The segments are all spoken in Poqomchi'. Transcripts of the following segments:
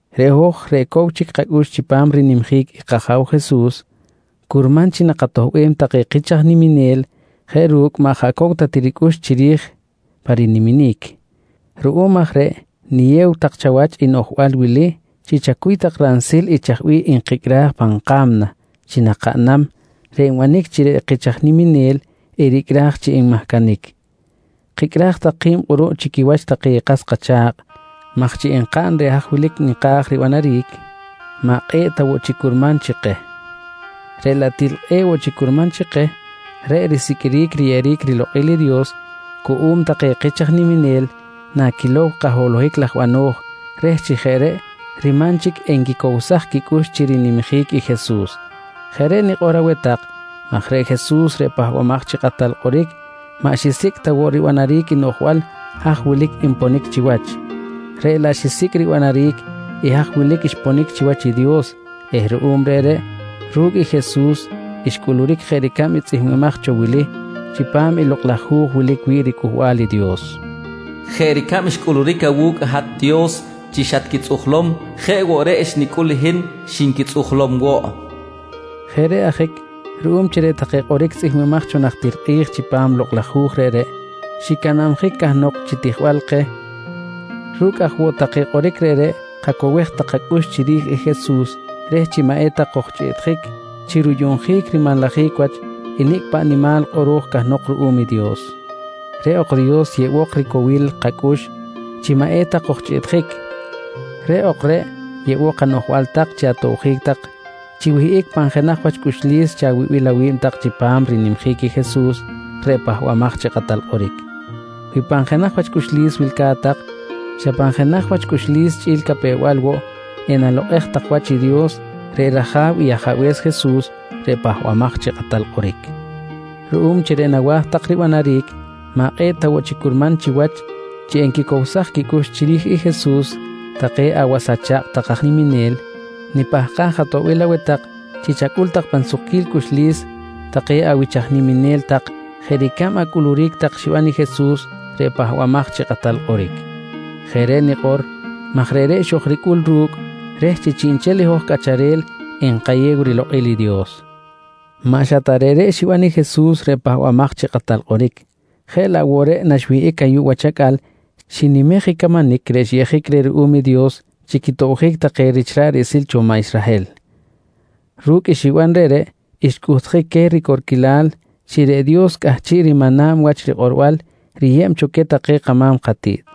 Reꞌ hoj reꞌ cow chic kacꞌux chipam i rinimjic i kAja̱w Jesus, curman chi nakatoꞌbem take kich aj niminel jeꞌ ru̱cꞌ maꞌ jaꞌ cow ta ti ricꞌux chiri̱j pa riniminic. Ruꞌum aj reꞌ niyew tak chawach i noꞌjbal wili chi kacuy tak ransil i chaj bih nkicꞌraj pa̱m ka̱mna chi nakaꞌnam reꞌ enbanic chi reꞌ kich aj niminel ericꞌraj chi enmahcanic. Kicꞌraj tak ki̱b kꞌuruꞌ chi quiwach take kas kacha̱kꞌ maj chi enkaꞌn reꞌ haj wilic nka̱j ribanaric, maꞌ kꞌe̱ꞌ ta woꞌ chic curman chi keh. Reꞌ laꞌ til kꞌe̱ꞌ woꞌ chic curman chi keh reꞌ risiqꞌuiric riyeꞌeric rilokꞌil i Dios cuꞌum take kich aj niminel naquilom kaholohic laj bano̱j reh chi jeꞌ reꞌ riman chic enquicowsaj quicꞌux chi rinimjic i Jesus. Jeꞌ reꞌ nikꞌor aweh tak maj reꞌ Jesus reꞌ Pahbamaj chi Kꞌatal Kꞌoric maꞌ xisicꞌ ta woꞌ ribanaric i noꞌjbal haj wilic xponic chiwach, reꞌ laꞌ xisicꞌ ribanaric i haj wilic xponic chiwach i Dios eh ruꞌum reꞌreꞌ ru̱cꞌ Jesus xcꞌuluric jeꞌ ricab i tzꞌihmbimaj cho wili chipam i Lokꞌ laj Hu̱j wilic wi̱ꞌ riCꞌuhbal i Dios: “Jeꞌ ricab xcꞌuluric awu̱cꞌ hat Dios chi xatquitzꞌujlom jeꞌ woꞌ reꞌ xnicꞌul hin xinquitzꞌujlom woꞌ, nqui rikꞌor. Jeꞌ reꞌ ajic ruꞌum chi reꞌ take kꞌoric tzꞌihmbimaj cho najtir kꞌi̱j chipam i Lokꞌ laj Hu̱j reꞌreꞌ xicanabjic cahnok chi tijbal keh, ru̱cꞌ aj woꞌ take kꞌoric reꞌreꞌ kacowej tak kacꞌux chiri̱j i Jesus reh chi maꞌ eta kojchꞌiꞌtjic chi ruyuꞌnjic rimanlajic wach i nicꞌ paꞌ nimal kꞌoro̱j cahnok ruꞌum i Dios. Reꞌ ok Dios yeꞌbok ricowil kacꞌux chi maꞌ eta kojchꞌiꞌtjic. Reꞌ ok reꞌ yeꞌbok anoꞌjbal tak chi atobjic tak chi wihꞌic pan jenaj wach cꞌuxlis chawibil awi̱b tak chipam rinimjic i Jesus reꞌ Pahbamaj chi Kꞌatal Kꞌoric. Wi pan jenaj wach cꞌuxlis wilca̱t tak, xa pan jenaj wach cꞌuxlis chꞌi̱l capew-bal woꞌ enalokꞌej tak wach i Dios reꞌ rAja̱w i Ajabe̱s Jesus reꞌ Pahbamaj chi Kꞌatal Kꞌoric. Ruꞌum chi reꞌ nawa̱j nak tak ribanaric maꞌ kꞌe̱ꞌ ta woꞌ chic curman chiwach chi enquicowsaj quicꞌux chiri̱j i Jesus take awas acha̱kꞌ tak aj niminel, nipahkaj atoꞌbil aweh tak chi chacꞌul tak pan sukquil cꞌuxlis take awich aj niminel tak jeꞌ ricab acꞌuluric tak xiban i Jesus reꞌ Pahbamaj chi Kꞌatal Kꞌoric. Jeꞌ reꞌ nikꞌor maj reꞌreꞌ xojricꞌul ru̱cꞌ reh chi chiꞌnchel i hoj cꞌacharel enkayew rilokꞌil i Dios. Maꞌ xa ta reꞌreꞌ xiban i Jesus reꞌ Pahbamaj chi Kꞌatal Kꞌoric jeꞌ laꞌ woꞌ reꞌreꞌ naxwihꞌic ayuꞌ wach acꞌal xinimej i camanic reꞌ xyeꞌjic ruꞌum i Dios chi quitobjic take rich ra̱ꞌ riꞌsil cho maꞌ Israhel. Ru̱cꞌ i xiban reꞌreꞌ xcꞌuhtjic queh ricorquilal chi reꞌ Dios cꞌahchiꞌ rimana̱b wach rikꞌorbal riyeb cho queh take kama̱m katiꞌt.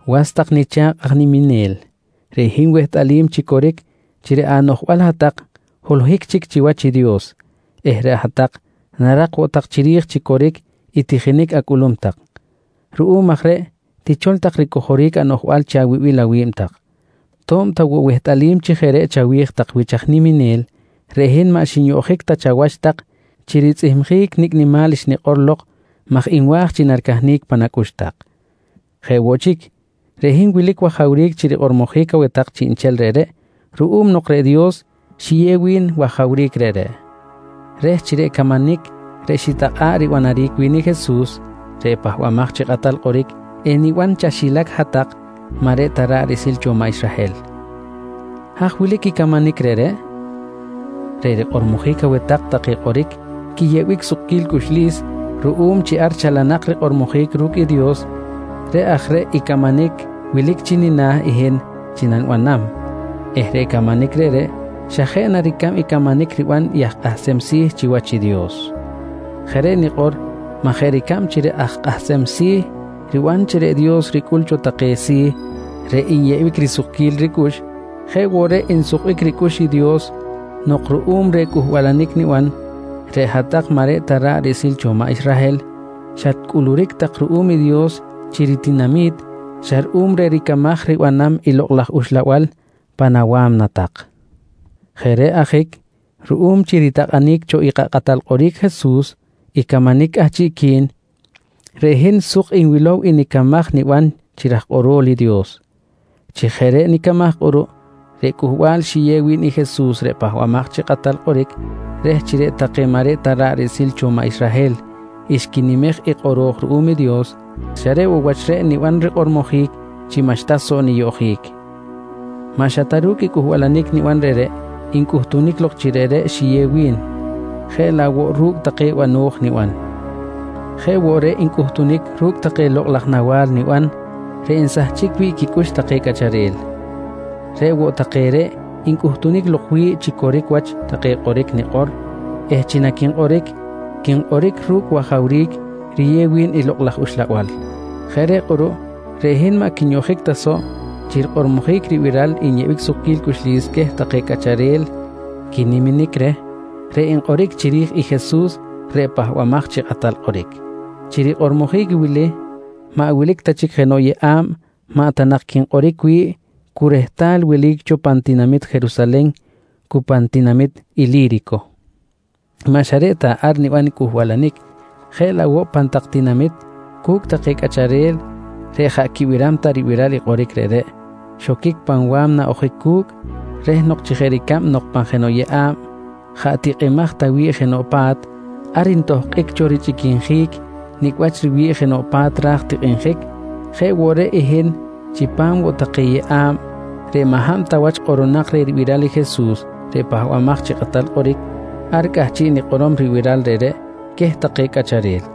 Was tak nicha̱kꞌ aj niminel, reꞌ hin wehtꞌalim chi coric chi reꞌ anoꞌjbal hat-tak holohic chic chiwach i Dios eh reꞌ hat-tak narak woꞌ tak chiri̱j chi coric i tijinic acꞌulum tak. Ruꞌum aj reꞌ tichol tak ricojoric anoꞌjbal chi awibil awi̱b tak. To̱b ta woꞌ wehtꞌalim chi jeꞌ reꞌ chawi̱j tak wich aj niminel, reꞌ hin maꞌ xinyoꞌjic ta chawach tak chi ritzꞌihmjic nicꞌ nimal xnikꞌor lok maj nwa̱j chi naricahnic pan acꞌux tak. Jeꞌ woꞌ chic, reꞌ hin wilic wajawric chi rikꞌormojic aweh tak chiꞌnchel reꞌreꞌ ruꞌum nok reꞌ Dios xiyew wi̱n wajawric reꞌreꞌ reh chi reꞌ camanic reꞌ xitakꞌa̱ꞌ ribanaric wi̱n i Jesus reꞌ Pahbamaj chi Kꞌatal Kꞌoric eniban chaxilac hat-tak maꞌ reꞌ ta ra̱ꞌ riꞌsil cho maꞌ Israhel. Haj wilic i camanic reꞌreꞌ? Reꞌ rikꞌormojic aweh tak take kꞌoric quiyeꞌbic sukquil cꞌuxlis ruꞌum chi ar chalanak rikꞌormojic ru̱cꞌ i Dios, reꞌ aj reꞌ i camanic wilic chi nina̱ i hin chi nanibanam eh reꞌ camanic reꞌreꞌ xa jeꞌ na ricab i camanic riban i aj kꞌahsem si̱ chiwach i Dios. Jeꞌ reꞌ nikꞌor maj jeꞌ ricab chi reꞌ aj kꞌahsem si̱ riban chi reꞌ Dios ricꞌul cho take si̱ reꞌ nyeꞌbic risukquil ricꞌux, jeꞌ woꞌ reꞌ nsukbic ricꞌux i Dios nok ruꞌum reh cꞌuhbalanic niban, reꞌ hat-tak maꞌ reꞌ ta ra̱ꞌ riꞌsil cho maꞌ Israhel xatcꞌuluric tak ruꞌum i Dios chi ritinami̱t xa ruꞌum reh ricamaj ribanam i Lokꞌ laj Uxlabal pan awa̱mna tak. Jeꞌ reꞌ ajic ruꞌum chi ritakꞌanic cho i kaKꞌatal Kꞌoric Jesus i camanic cꞌahchiꞌqui̱n, reꞌ hin suk nwilow i nicamaj niban chi raj kꞌorol i Dios. Chi jeꞌ reꞌ nicamaj kꞌuruꞌ reꞌ cꞌuhbal xiyew wi̱n i Jesus reꞌ Pahbamaj chi Kꞌatal Kꞌoric reh chi reꞌ take maꞌ reꞌ ta ra̱ꞌ riꞌsil cho maꞌ Israhel xquinimej i kꞌoro̱j ruꞌum i Dios xa reꞌ woꞌ wach reꞌ niban rikꞌormojic chi maꞌxta soꞌ niyoꞌjic. Maꞌ xa ru̱cꞌ ta cꞌuhbalanic niban reꞌreꞌ ncꞌuhtunic lok chi reꞌreꞌ xiyew wi̱n, jeꞌ laꞌ woꞌ ru̱cꞌ take bano̱j niban. Jeꞌ woꞌ reꞌ ncꞌuhtunic ru̱cꞌ take lokꞌ laj nawa̱l niban reꞌ nsahchic wi̱ꞌ quicꞌux take cꞌacharel. Reꞌ woꞌ take reꞌ ncꞌuhtunic lok wi̱ꞌ chi coric wach take kꞌoric nikꞌor eh chi naquinkꞌoric, quinkꞌoric ru̱cꞌ wajawric riyew wi̱n i Lokꞌ laj Uxlabal. Jeꞌ reꞌ kꞌuruꞌ reꞌ hin maꞌ quinyoꞌjic ta soꞌ chi rikꞌormojic ribiral nyeꞌbic sukquil cꞌuxlis queh take cꞌacharel quiniminic reh reꞌ nkꞌoric chiri̱j i Jesus reꞌ Pahbamaj chi Kꞌatal Kꞌoric. Chi rikꞌormojic wili maꞌ wilic ta chic jenoꞌ yeꞌa̱b maꞌ ta nak quinkꞌoric wi̱ꞌ cu rehtal welic cho pan tinamit Jerusalen cu pan tinamit Ili̱rico. Maꞌ xa reꞌ ta ar niban i cꞌuhbalanic, jeꞌ laꞌ woꞌ pan tak tinamit cu̱cꞌ take cꞌacharel reꞌ jaꞌ quibiram ta ribiral kꞌoric reꞌreꞌ xoquic pan wa̱mna ojic cu̱cꞌ reh nok chi jeꞌ ricab nok pan jenoꞌ yeꞌa̱b jaꞌ tikꞌimaj ta wi̱ꞌ jenoꞌ pa̱t ar ntohkꞌic cho richꞌiquinjic nicꞌ wach riwi̱ꞌ jenoꞌ pa̱t ra̱j tikꞌinjic, jeꞌ woꞌ reꞌ i hin chipam woꞌ take yeꞌa̱b reꞌ maꞌ hab ta wach kꞌoꞌronak reh ribiral i Jesus reꞌ Pahbamaj chi Kꞌatal Kꞌoric, ar cꞌahchiꞌ nikꞌorom ribiral reꞌreꞌ queh take cꞌacharel.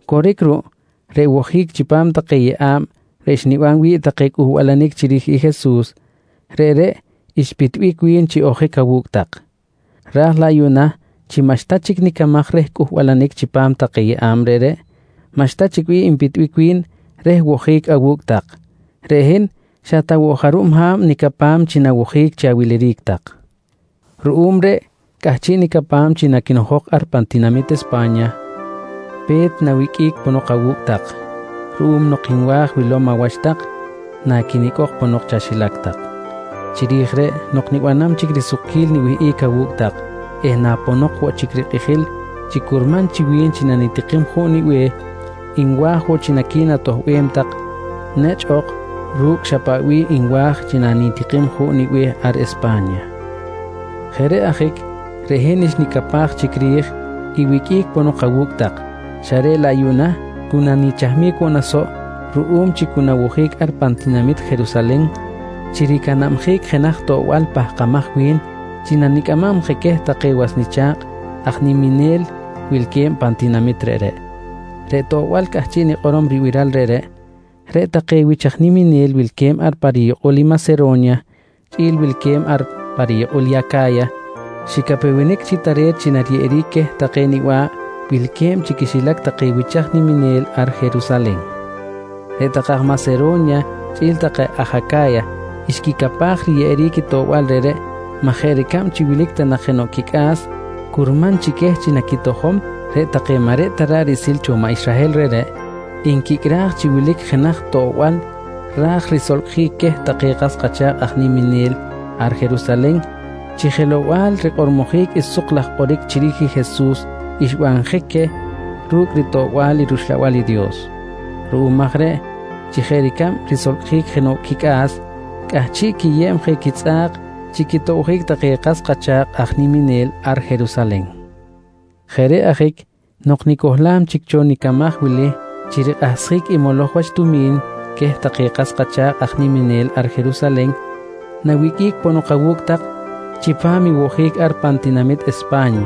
Coric ruꞌ chi reꞌ wojic chipam take yeꞌa̱b reꞌ xniban wi̱ꞌ take cꞌuhbalanic chiri̱j i Jesus, reꞌreꞌ xpitbic wi̱n chi ojic awu̱cꞌ tak. Raj laꞌ yuꞌna chi maꞌxta chic nicamaj reh cꞌuhbalanic chipam take yeꞌa̱b reꞌreꞌ, maꞌxta chic bih npitbic wi̱n reh wojic awu̱cꞌ tak. Reꞌ hin xa ta woꞌ jarub ha̱b nicapam chi nawojic chi awiliric tak. Ruꞌum reꞌ cꞌahchiꞌ nicapam chi naquinojok ar pan tinamit Espa̱nya, pe̱t nawiqꞌuic ponok awu̱cꞌ tak, ruꞌum nok nwa̱j wilom awach tak naquinicꞌok ponok chaxilac tak. Chiri̱j reꞌ nok nibanam chic risukquil niwihꞌic awu̱cꞌ tak eh naponok woꞌ chic rikꞌijil chi curman chi wi̱n chi nanitikim juꞌ nibe̱h, nwa̱j woꞌ chi naqui̱natoꞌbem tak nechꞌ ok ru̱cꞌ xa paꞌ bih nwa̱j chi nanitikim juꞌ nibe̱h ar Espa̱nya. Jeꞌ reꞌ ajic reꞌ hin xnicapaj chic ri̱j i wiqꞌuic ponok awu̱cꞌ tak xa reꞌ laꞌ yuꞌna cu nanichahmic woꞌ na soꞌ ruꞌum chi cu nawojic ar pan tinamit Jerusalen chi ricanabjic jenaj toꞌbal pahkamaj wi̱n chi nanicꞌamam je queh take was nicha̱kꞌ aj niminel wilque̱b pan tinamit reꞌreꞌ. Reꞌ toꞌbal cꞌahchiꞌ nikꞌorom ribiral reꞌreꞌ, reꞌ take wich aj niminel wilque̱b ar pa riyukꞌul i Masero̱nya chꞌi̱l wilque̱b ar pa riyukꞌul Aca̱ya xicapewenic chi tare̱t chi nariyeꞌeric queh take niba̱ꞌ wilque̱b chi quixilac take wich aj niminel ar Jerusalen. Reꞌ take aj Masero̱nya chꞌi̱l take aj Aca̱ya xquicapaj chi riyeꞌeric i toꞌbal reꞌreꞌ maj jeꞌ ricab chi wilic ta nak jenoꞌ quicꞌa̱s curman chi queh chi naquitojom, reꞌ take maꞌ reꞌ ta ra̱ꞌ riꞌsil cho maꞌ Israhel reꞌreꞌ nquicꞌraj chi wilic jenaj toꞌbal ra̱j risolcꞌjic queh take kas kacha̱kꞌ aj niminel ar Jerusalen chi jelow-bal rikꞌormojic i suk laj kꞌoric chiri̱j i Jesus xbanjic queh ru̱cꞌ ritoꞌbal i rUxlabal i Dios. Ruꞌum aj reꞌ chi jeꞌ ricab risolcꞌjic jenoꞌ quicꞌa̱s, cꞌahchiꞌ quiyeb je quitzꞌa̱k chi quitobjic take kas kacha̱kꞌ aj niminel ar Jerusalen. Jeꞌ reꞌ ajic nok nicohlam chic cho nicamaj wili chi rikꞌahsjic i moloj wach tumi̱n queh take kas kacha̱kꞌ aj niminel ar Jerusalen, nawiqꞌuic ponok awu̱cꞌ tak chipam i wojic ar pan tinamit Espa̱nya.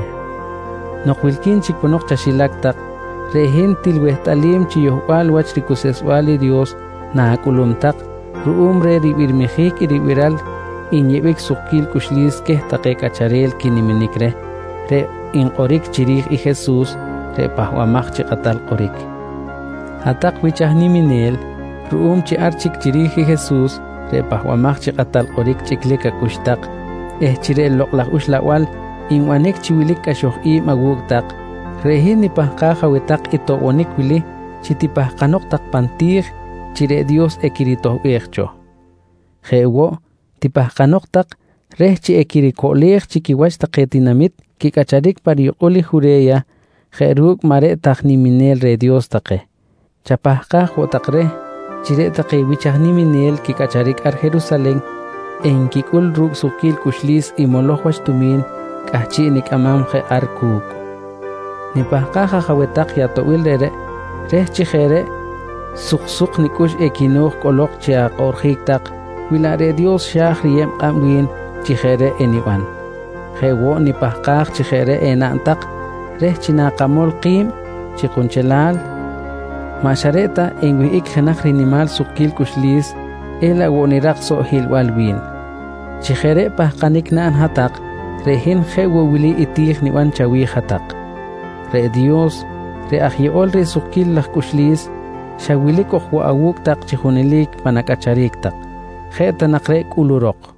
Nok wilqui̱n chic ponok chaxilac tak reꞌ hin til wehtꞌalim chi yohbal wach ricuseꞌsbal i Dios na̱cꞌulum tak ruꞌum reh ribirmijic i ribiral nyeꞌbic sukquil cꞌuxlis queh take cꞌacharel quiniminic reh reꞌ nkꞌoric chiri̱j i Jesus reꞌ Pahbamaj chi Kꞌatal Kꞌoric. Hat-tak wich aj niminel, ruꞌum chi ar chic chiri̱j i Jesus reꞌ Pahbamaj chi Kꞌatal Kꞌoric chꞌiclic acꞌux tak eh chi reꞌ Lokꞌ laj Uxlabal nbanic chi wilic cꞌaxoj i̱b awu̱cꞌ tak, reꞌ hin nipahkaj aweh tak i toꞌbonic wili chi tipahkanok tak pan ati̱j chi reꞌ Dios equiritoꞌbej cho. Jeꞌ woꞌ, tipahkanok tak reh chi equiricoꞌlej chi quiwach take tinamit quicꞌacharic pa riyukꞌul Jure̱ya jeꞌ ru̱cꞌ maꞌ reꞌ ta aj niminel reh Dios take. Chapahkaj woꞌ tak reh chi reꞌ take wich aj niminel quicꞌacharic ar Jerusalen enquicꞌul ru̱cꞌ sukquil cꞌuxlis i moloj wach tumi̱n cꞌahchiꞌ nicꞌamam je ar cu̱cꞌ. Nipahkaj aj aweh tak i atoꞌbil reꞌreꞌ reh chi jeꞌ reꞌ suksuk nicꞌux equino̱j cꞌolok chi akꞌoꞌrjic tak wi laꞌ reꞌ Dios xa̱j riyeb kꞌab wi̱n chi jeꞌ reꞌ eniban. Jeꞌ woꞌ nipahkaj chi jeꞌ reꞌ enaꞌn tak reh chi nakamol ki̱b chi kunchelal, maꞌ xa reꞌ ta enwihꞌic jenaj rinimal sukquil cꞌuxlis elaꞌ woꞌ nirak soꞌ hiꞌlbal wi̱n. Chi jeꞌ reꞌ pahkanic naꞌn hat-tak reꞌ hin jeꞌ woꞌ wili i ti̱j niban chawi̱j hat-tak: Reꞌ Dios reꞌ aj yeꞌol reh risukquil laj cꞌuxlis, xa wilic ok woꞌ awu̱cꞌ tak chi junelic pan acꞌacharic tak. Jeꞌ ta nak reꞌ cꞌulurok.